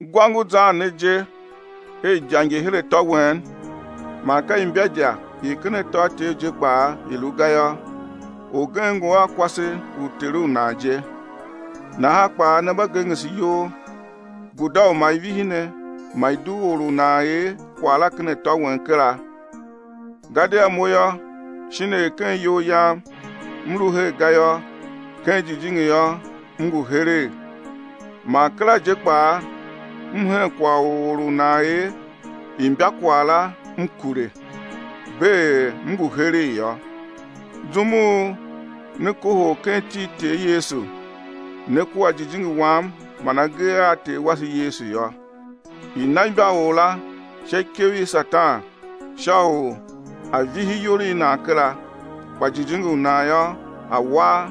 Gwa ngu zan ne je er idya ngi her atô wen, man ka imbaidya i ken atôatyev je kpaa i lu ga yô, orgen ngu a kwase u ter u nan je. Nahan kpaa ne mba gengese iyol; guda u ma i vihi ne, ma i dugh or u nan er kwagh la ken atô wen kera. Gadia mo yô, shin er ken iyol yam m lu her ga yô, ken jijingi yô, m ngu heregh, man kera je kpaa m hen kwagh u or u nan er imbakwagh la, m kure, bee er m ngu heregh yô. Zum u ne kohol ken iti i Ter Yesu, ne kua jijingi wam man agee a Ter wase Yesu yô, i̱ na imbaor la sha ikev i Satan sha u á vihi iyol i nan kera, kpa jijingi u nan yô, a̱ war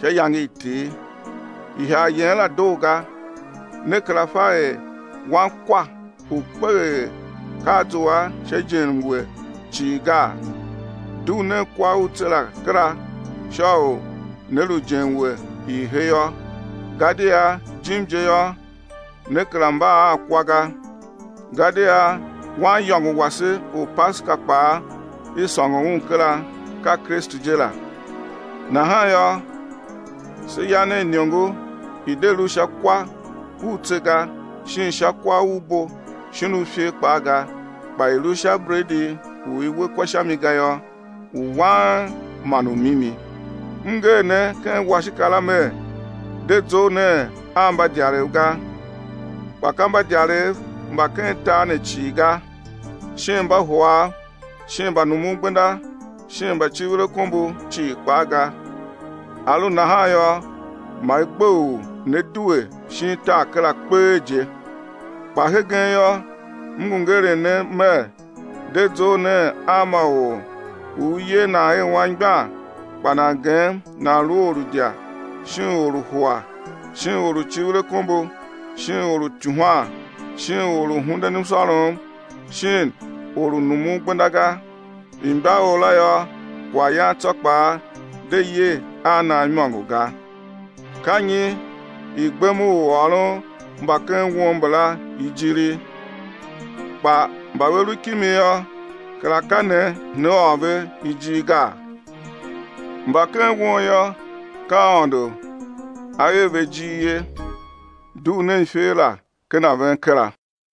sha iyange i Ter. Ihagh yen la doo ga. Ne kera fa er wankwa u kpeghee ka a zua sha ijenmwe cii ga? Dugh nen kwa u tse la kera sha u né lu ijenmwe i he yô, gadia jim je yô, ne kera mba a kwa ga. Gadia Waniyôngo wase u Paseka kpaa i sôngo un kera, ka Kristu je la. Nahan yô, se ya nen iniongo i̱ de lu sha kwa u tse ga, shin sha kwa u bo shin u ifer kpaa ga, kpa i̱ lu sha bredi u i we kwa sha mi ga yô, u wang man u mimi. M nger ne ken washika la mer, de zough nen a mbadyarev ga. Kpa ka mbadyarev mba ken tar ne cii ga, shin Mbahuav shin mbanumungbenda shin mbacivirakombo cii kpaa ga, a lu nahan yô, ma i gbe u né due shin tar kera kpee je. Kpa hegen yô, m ngu ngeren ne mer: De zough nen a ma or u i yer nan er anmgbian kpa nan gem nan lu or u idya shin u hua shin or u civir akombo shin or u ityuhwan shin or u hunden msôrom shin or numun gbenda ga; imbaor la yô, kwaghyan tsô kpaa de ye a nan imôngo ga. Ka nyi i gbem u ôron mba ken won mbala ijiri? Kpa mba ve lu kimi yô, kera ka ne né or ve ijir gaa? Mba ken won yô, ka Aôndo A er ve ijir ye. Dugh nen iferor la ken a ven kera.